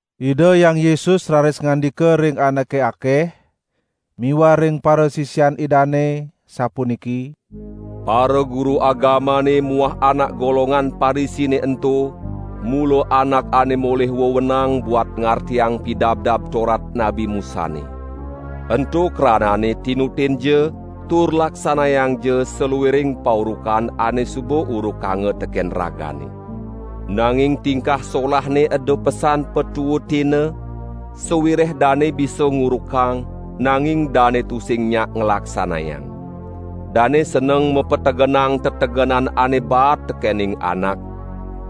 Ida Hyang Yesus raris ngandika ring anake akeh miwah ring parasisian Idane, sapuniki: "Paraguru agamane muah anak golongan Parisine ento mula anak ane molih wewenang buat ngartiang Pidabdab Torat Nabi Musane. Ento kranane tinutinja tur laksanayangja saluiring paurukan ane suba urukanga teken ragane. Nanging tingkah solahne eda pesan patuutina, sawireh dane bisa ngurukang, nanging dane tusing nyak nglaksanayang. Dane seneng mategenang tetegenan ane baat tekening anak,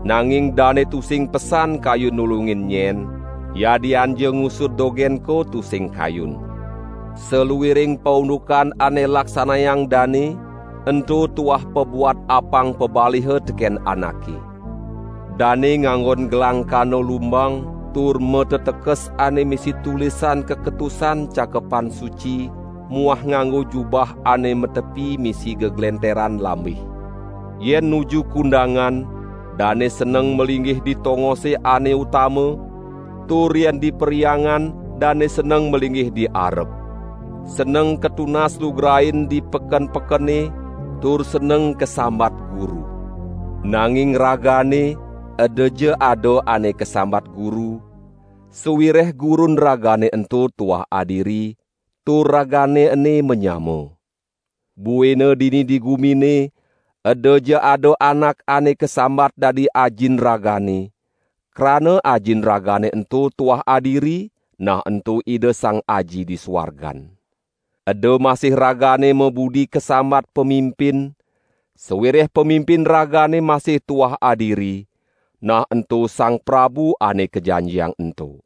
nanging dane tusing pesan kayun nulungin nyen, yadianja ngusud dogenko tusing kayun. Saluiring paundukan ane laksanayang dane, ento tuah pabuat apang pabaliha teken anake. Dane nganggon gelang kana lumbang tur matetekes ane misi tulisan kaketusan Cakepan Suci muah nganggo jubah ane matepi misi geglenteran lambih. Yen nuju kundangan, dane seneng malinggih di tongose ane utama, tur yen di perhyangan, dane seneng malinggih di arep. Seneng katunas lugrain di peken-pekene, tur seneng kasambat guru. Nanging ragane edaja ada ane kasambat guru, sawireh Gurun ragane ento tuah adiri tur ragane ene manyama. Buina dini di gumine, edaja ada anak ane kasambat dadi Ajin ragane, krana Ajin ragane ento tuah adiri, nah ento Ida Sang Aji di suargan. Eda masih ragane mabudi kasambat pamimpin, sawireh Pamimpin ragane masih tuah adiri, nah ento Sang Prabu Ane Kajanjiang ento.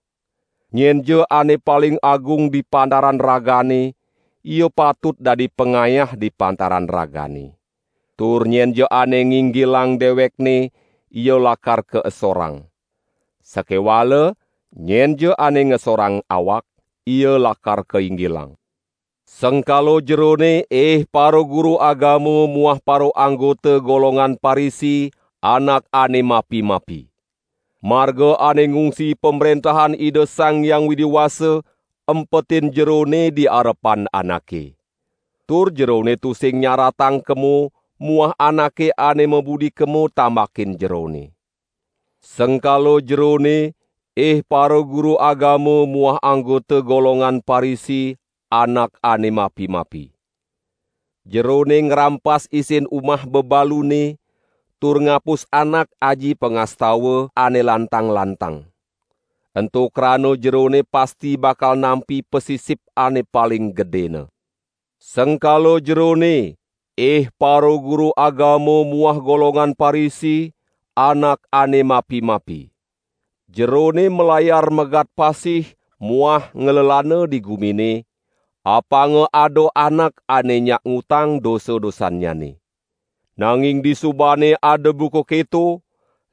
Nyenja ane paling agung di pantaran ragane, ia patut dadi pangayah di pantaran ragane. Tur nyenja ane nginggiling dewekne ia lakar kaesorang. Sakewala nyenja ane ngesorang awak, ia lakar kainggilang." "Sengkala jerone, ih paraguru agama muah paraanggota golongan Parisi, anak ane mapi-mapi. Marga ane ngungsi Pamrentahan Ida Sang Hyang Widi Wasa empetin jerone di arepan anake. Tur jerone tusing nyaratang kemo muah anake ane mabudi kemo tambakin jerone. [ Sengkala jerone, ih paraguru agama muah anggota golongan Parisi anak ane mapi-mapi. Jerone ngrampas isin umah bebalune, tur ngapus anak aji pangastawan ane lantang-lantang. Ento krana jerone pasti bakal nampi pasisip ane paling gedena.] Sengkala jerone, ih paraguru agama muah golongan Parisi, anak ane mapi-mapi. Jerone malayar megat pasih muah nglelana di gumine, apanga ada anak ane nyak ngutang dosa-dosannyane. Nanging di subane ada buka keto,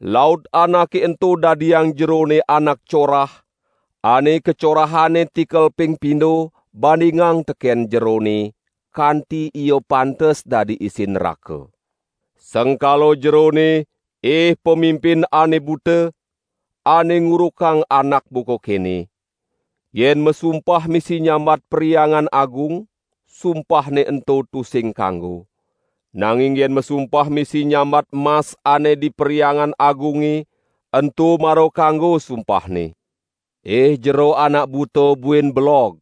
laut anake ento dadiang jerone anak corah, ane kacorahane tikel ping pindo bandingang teken jerone, kanti ia pantes dadi isin nraka. Sengkala jerone, ih pamimpin ane buta, ane ngurukang anak buka kene: 'Yen masumpah misi nyambat Perhyangan Agung, sumpahne ento tusing kanggo. Nanging yen masumpah misi nyambat mas ane di Perhyangan Agunge, ento mara kanggo sumpahne.' Ih jero anak buta buin belog,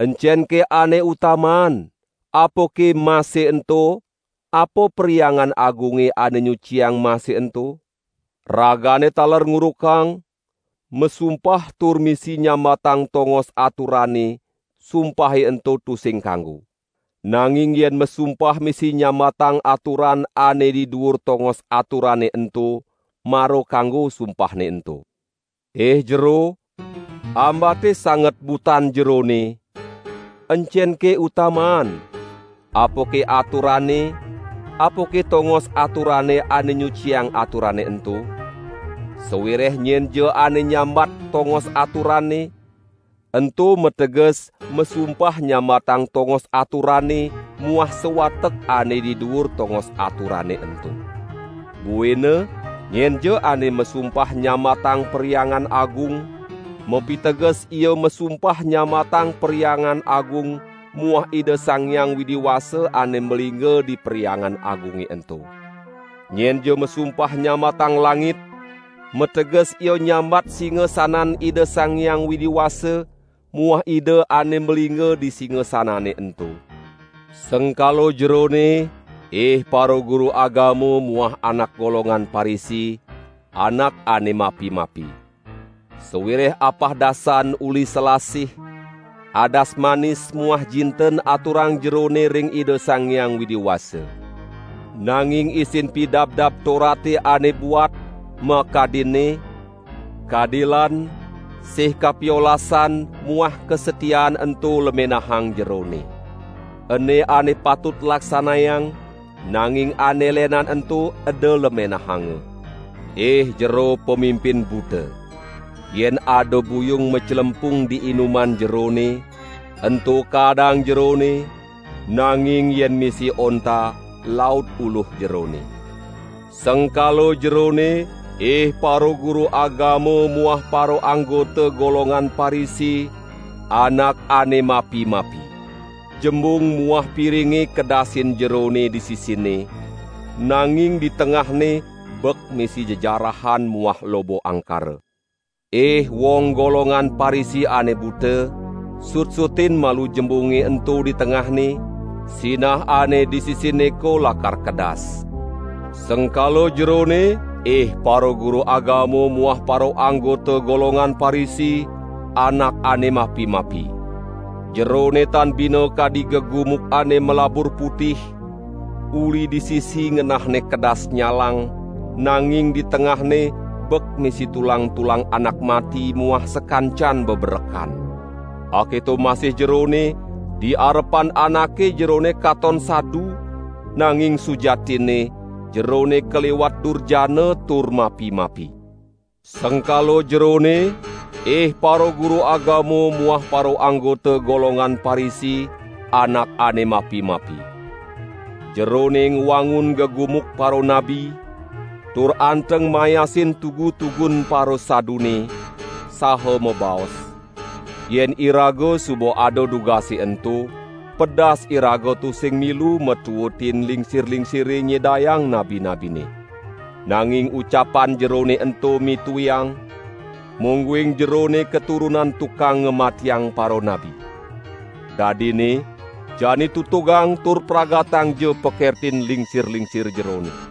encenke ane utamaan, apake mase ento apa Perhyangan Agunge ane nyuciang mase ento? Ragane taler ngurukang: 'Masumpah tur misi nyambatang tongos aturane, sumpahe ento tusing kanggo. Nanging yen masumpah misi nyambatang aturan ane di duur tongos aturane ento, mara kanggo sumpahne ento.' Ih jero, ambate sanget butan jerone, encenke utamaan: apake aturane, apake tongos aturane ane nyuciang aturane ento? Sawireh nyenja ane nyambat tongos aturane, ento mateges masumpah nyambatang tongos aturane muah sawatek ane di duur tongos aturane ento. Buina nyenja ane masumpah nyambatang Perhyangan Agung, mapiteges ia masumpah nyambatang Perhyangan Agung muah Ida Sang Hyang Widi Wasa ane malingga di Perhyangan Agunge ento. Nyenja masumpah nyambatang langit, mateges ia nyambat singasanan Ida Sang Hyang Widi Wasa muah Ida ane malingga di singasanane ento. Sengkala jerone ih paraguru agama muah anak golongan Parisi, anak ane mapi-mapi. Sawireh apahdasan uli selasih, adas manis muah jinten aturang jerone ring Ida Sang Hyang Widi Wasa. Nanging isin Pidabdab Torate ane buat, makadinne: kadilan, sih kapiolasan muah kasatiaan ento lemenahang jerone. Ene ane patut laksanayang, nanging ane lenan ento eda lemenahanga. Ih jero pamimpin buta. Yen ada buyung maclempung di inuman jerone, ento kaadang jerone, nanging yen misi onta laut uluh jerone. Sengkala jerone, ih paraguru agama muah paraanggota golongan Parisi, anak ane mapi-mapi. Jembung muah piringe kedasin jerone di sisinne, nanging di tengahne bek misi jejarahan muah loba angkara. Ih wong golongan Parisi ane buta, sutsutin malu jembunge ento di tengahne, sinah ane di sisinneko lakar kedas. Sengkala jerone, ih paraguru agama muah paraanggota golongan Parisi, anak ane mapi-mapi. Jerone tan bina kadi gegumuk ane malabur putih, uli di sisi ngenahne kedas nyalang, nanging di tengahne bek misi tulang-tulang anak mati muah sakancan beberekan. Aketo masih jerone, di arepan anake jerone katon sadu, nanging sujatinne jerone kaliwat durjana tur mapi-mapi." "Sengkala jerone, ih paraguru agama muah paraanggota golongan Parisi, anak ane mapi-mapi. Jerone ngwangun gegumuk paranabi tur anteng mayasin tugu-tugun parasadune, saha mabaos: 'Yen iraga suba ada dugase ento, pedas iraga tusing milu matuutin lingsir-lingsire nyedayang nabi-nabine.' Nanging ucapan jerone ento mituiang, mungguing jerone katurunan tukang ngamatiang paranabi. Dadinne jani tutugang tur pragatangja pakertin lingsir-lingsir jerone!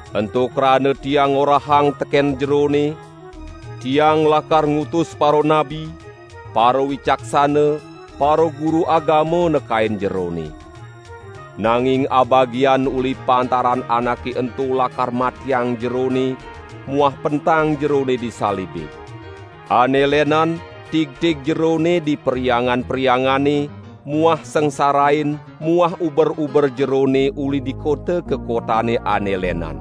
Ento krana Tiang ngorahang teken jerone, Tiang lakar ngutus paranabi, parawicaksana, paraguru agama nekain jerone. Nanging abagian uli pantaran anake ento lakar matiang jerone muah pentang jerone di salibe. Ane lenan tigtig jerone di perhyangan-perhyangane muah sangsarain muah uber-uber jerone uli di kota ka kotane ane lenan.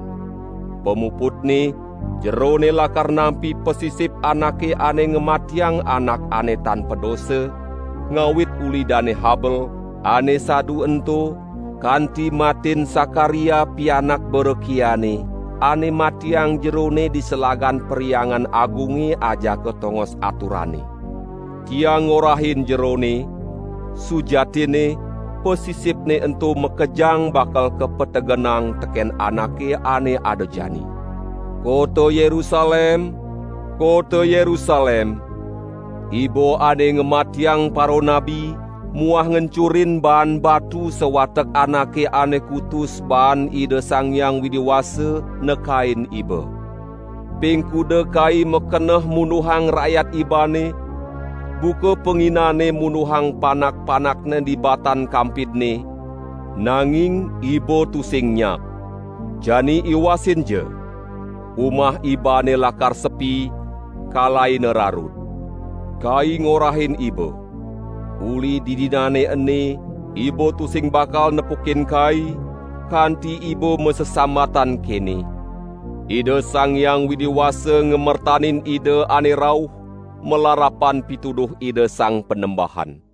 Pamuputne jerone lakar nampi pasisip anake ane ngamatiang anak ane tan padosa, ngawit uli Dane Habel, ane sadu ento, kanti matin Sakaria pianak Berekiane, ane matiang jerone di selagan Perhyangan Agunge ajaka tongos aturane. Tiang ngorahin jerone: Sujatinne pasisipne ento makejang bakal kapetegenang teken anake ane ada jani." "Kota Yerusalem, kota Yerusalem, iba ane ngamatiang paranabi muah ngencurin baan batu sawatek anake ane kutus baan Ida Sang Hyang Widi Wasa nekain iba! Ping kuda Kai makeneh munduhang rakyat ibane, buka panginane munduhang panak-panakne di batan kampidne, nanging iba tusing nyak. Jani iwasinja! Umah ibane lakar sepi, kalaina rarud. Kai ngorahin iba: uli didinane ene iba tusing bakal nepukin Kai, kanti iba masesambatan kene: 'Ida Sang Hyang Widi Wasa ngamertanin Ida ane rauh malarapan pituduh Ida Sang Panembahan.' "